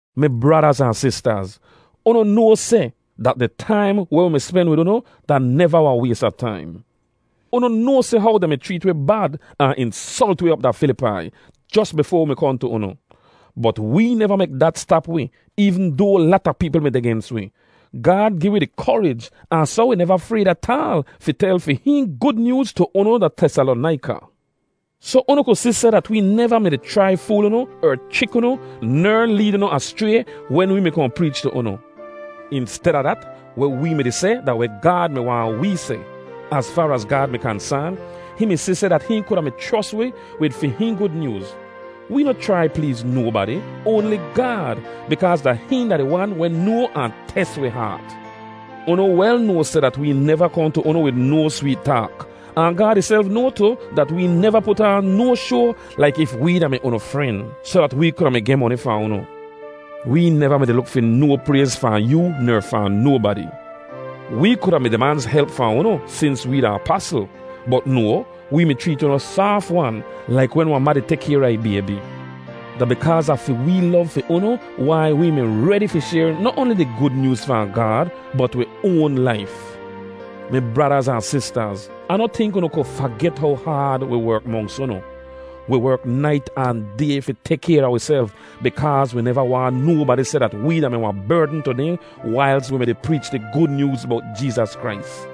Mi bradaz ahn sistaz, unu noa seh dat di taim weh wi mi spen wid unu da neva wahn ways a taim. Unu noa seh how dehn mi chreet wi bad ahn insolt wi op da Filipai, jos bifoa wi mi kohn tu unu. Bot wee neva mek dat stap wi eevn doa lata peepl mi deh gens wi; Gaad gi wi di korij ahn soh wi neva frayd ataal fi tel fi hihn Gud Nyooz tu unu da Tesalonaika. Soh unu ku si seh dat wee neva mi-di chrai fool unu er chrik unu ner leed unu aschray wen wee mi kohn preech tu unu. Insteda dat, weh wee mi-di seh da weh Gaad mi waahn wee seh. Az faar az Gaad mi kansaan, hihn mi si seh dat hihn kuda mi chros wi wid fi hihn Gud Nyooz. Wee noh chrai pleez nobadi, oanli Gaad, bikaaz da hihn da di Wan weh noa ahn tes wi haat. Unu wel noa seh dat wee neva kohn tu unu wid no sweet taak, ahn Gaad ihself noa tu dat wee neva put aan no shoa laik if wee da-mi unu fren soh dat wee kuda mi geh moni fahn unu. Wee neva mi-di luk fi no prayz fahn yoo ner fahn nobadi. Wee kuda mi dimanz help fahn unu sins wee da apasl. Bot no, wee mi chreet unu saaf-wan, laik wen wahn ma di tek kayr a ih baybi. Da bikaaz a fi wee lov fi unu wai wee mi redi fi shayr noh oanli di Gud Nyooz fahn Gaad, bot wi oan laif. Mi bradaz ahn sistaz, Ah noh tink unu ku faget how haad wi werk monks unu. Wi werk nait ahn day fi tek kayr a wiself bikaaz wi neva waahn nobadi seh dat wee da-mi wahn berdn tu dehn wailz wi mi-di preech di Gud Nyooz bowt Jeezas Krais.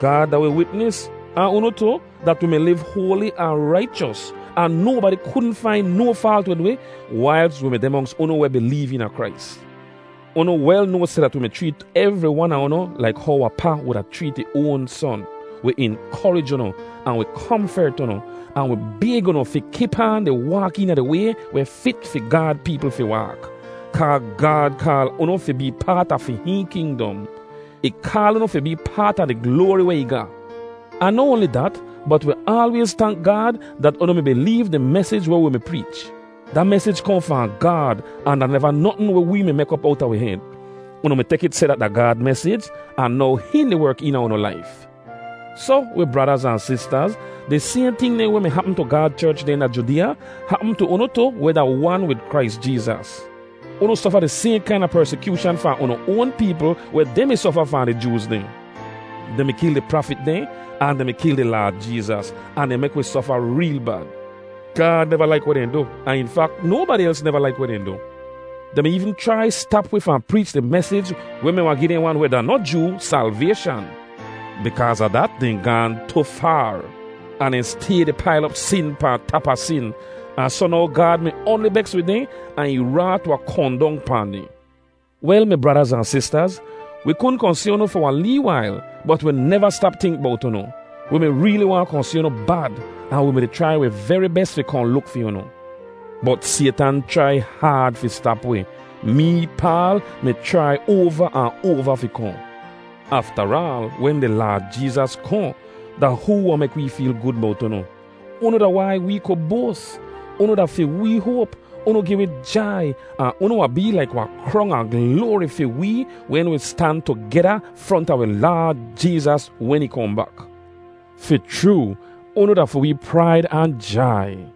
Gaad da wi witnis, ahn unu tu, dat wi mi liv hoali ahn raichos, ahn nobadi kudn fain no faalt wid wi wailz wi mi deh monks unu weh bileev eena Krais. Unu wel noa seh dat wi mi chreet evri wan a unu laik how wahn pa wuda chreet ih oan son. Wi inkorij unu, ahn wi komfert unu, ahn wi bayg unu fi kip aan di waak eena di way weh fit fi Gaad peepl fi waak. Kaa Gaad kaal unu fi bee paat a fi hihn kingdom. Ih kaal unu fi bee paat a di gloari weh ih ga. Ahn noh oanli dat, bot wi aalwayz tank Gaad dat unu mi bileev di mesij weh wi mi preech. Da mesij kohn fahn Gaad ahn da neva notn weh wee mi mek op owta wi hed. Unu mi tek it seh dat da Gaad mesij, ahn now hihn di werk eena unu laif. Soh, wi bradaz ahn sistaz, di sayhn ting dehn weh mi hapm tu Gaad cherch dehn da Judeeya hapm tu unu tu weh da wan wid Krais Jeezas. Unu sofa di sayhn kaina persikyooshan fahn unu oan peepl weh dehn mi sofa fahn di Jooz dehn. Dehn mi kil di prafit dehn, ahn dehn mi kil di Laad Jeezas, ahn dehn mek wi sofa reel bad. Gaad neva laik weh dehn du, ahn in fak, nobadi els neva laik weh dehn du. Dehn mi eevn chrai stap wi fahn preech di mesij weh mi wahn gi dehn wan weh da noh Joo salvayshan. Bikaaz a dat, dehn gaahn tu faar, ahn dehn stay di pail op sin pahn tap a sin, ahn soh now Gaad mi oanli beks wid dehn ahn ih raat wahn kohn dong pahn dehn. Wel, mi bradaz ahn sistaz, wi kudn kohn si unu fi wahn lee wail, bot wi neva stap tink bowt unu. Wi mi reeli waahn kohn si unu bad ahn wi mi-di chrai wi veri bes fi kohn luk fi unu. Bot Saytan chrai haad fi stap wi. Mee, Paal, mi chrai oava ahn oava fi kohn. Aftaraal, wen di Laad Jeezas kohn, da hoo wahn mek wi feel gud bot unu? Unu da wai wee ku boas. Unu da fi wee hoap, unu gi wee jai, ahn unu wahn bee laik wahn krong a gloari fi wee wen wi stan tugeda fronta wi Laad Jeezas wen ih kohn bak. Fi chroo, unu da fi wee praid ahn jai.